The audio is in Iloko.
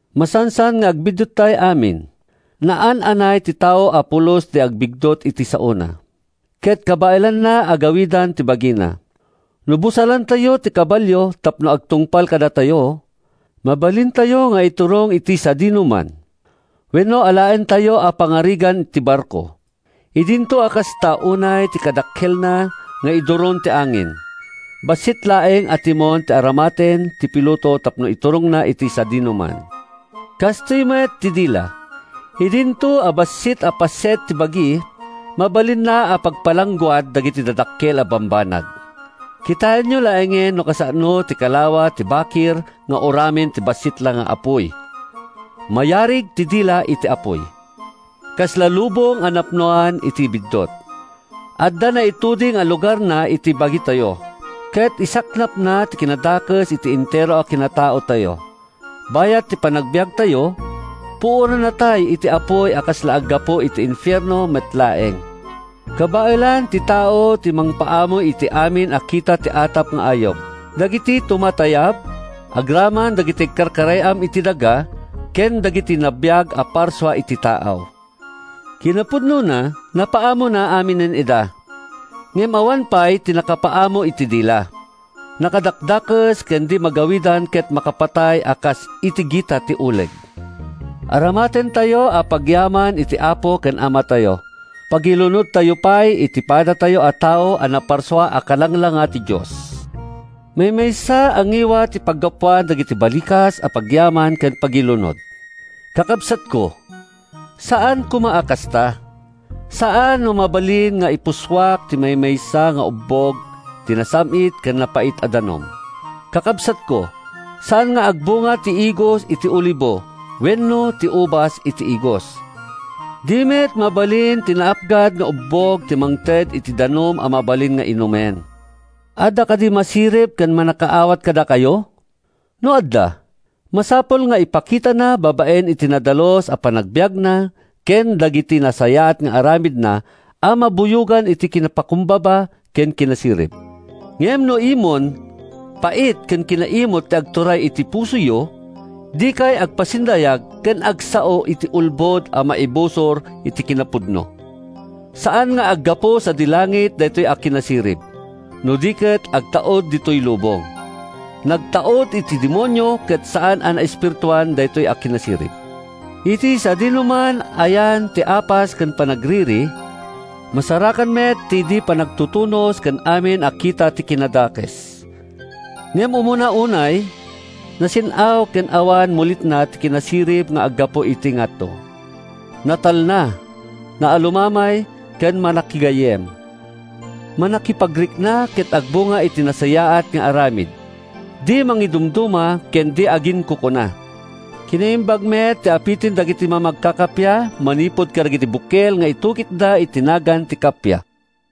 Masansan nga agbidduttay amin. Naan-anay ti tao a pulos a di agbiddut iti isaona, ket kabaelanna a gawidan ti bagina. No busalantayo ti kabalio tapno agtungpal kadatayo, mabalintayo nga iturong iti sadinoman. Wenno alaentayo a pangarigan ti barko: idinto a kasta unay ti kadakkelna nga iduron ti angin, bassit laeng a timon ti aramaten ti piloto tapno iturongna iti sadinoman. Kastoy met ti dila: Idinto a bassit a paset ti bagi, mabalinna a pagpalangguad dagiti dadakkel a bambanag. Kitaenyo laengen no kasano ti kalawa ti bakir nga uramen ti bassit la nga apuy. Mayarig ti dila iti apuy. Kasla lubong a napnoan iti biddut. Adda naituding a lugarna iti bagitayo, ket isaknapna ti kinadakes iti entero a kinataotayo. Bayat ti panagbiagtayo, puorannatay iti apuy a kasla aggapu iti infierno met laeng. Kabaelan ti tao ti mangpaamo iti amin a kita ti atap nga ayup, dagiti tumatayab, agraman dagiti agkarkarayam iti daga ken dagiti nabiag a parsua iti taaw. Kinapudnona, napaamona aminen ida. Ngem awan pay ti nakapaamo iti dila. Nakadakdakes ken di magawidan ket makapatay a kas iti gita ti uleg. Aramatentayo a pagyaman iti Apo ken Amatayo, pagilunodtayo pay iti padatayo a tao a naparsua a kalanglanga ti Dios. Maymaysa a ngiwat ti paggapuan dagiti balikas a pagyaman ken pagilunod. Kakabsatko, saan koma a kasta! Saan a mabalin nga ipussuak ti maymaysa nga ubbog ti nasam-it ken napait a danum. Kakabsatko, saan nga agbunga ti igos iti olibo wenno ti ubas iti igos. Di met mabalin ti naapgad nga ubbog ti mangted iti danum a mabalin nga inumen. Adda kadi masirib ken mannakaawat kadakayo? No adda, masapul nga ipakitana babaen iti nadalus a panagbiagna ken dagiti nasayaat nga aramidna a mabuyogan iti kinapakumbaba ken kinasirib. Ngem no imon, pait ken kinaimut ti agturay iti pusoyo, dikay agpasindayag ken agsao iti ulbod a maibusor iti kinapudno. Saan nga aggapu sadi langit daytoy a kinasirib, no di ket agtaud ditoy lubong. Nagtaud iti demonio ken saan a naespirituan daytoy a kinasirib. Iti sadinoman a yan ti apas ken panagririri, masarakan met ti di panagtutunos ken amin a kita ti kinadakes. Ngem, umuna unay, nasin-aw ken awan mulitna ti kinasirib nga aggapu iti ngato. Natalna, naalumamay ken mannakigayyem. Mannakipagrikna ket agbunga iti nasayaat nga aramid. Di mangidumduma ken di aginkukuna. Kinaimbag met ti apiten dagiti mamagkakappia manipud kadagiti bukel nga itukitda iti nagan ti kappia.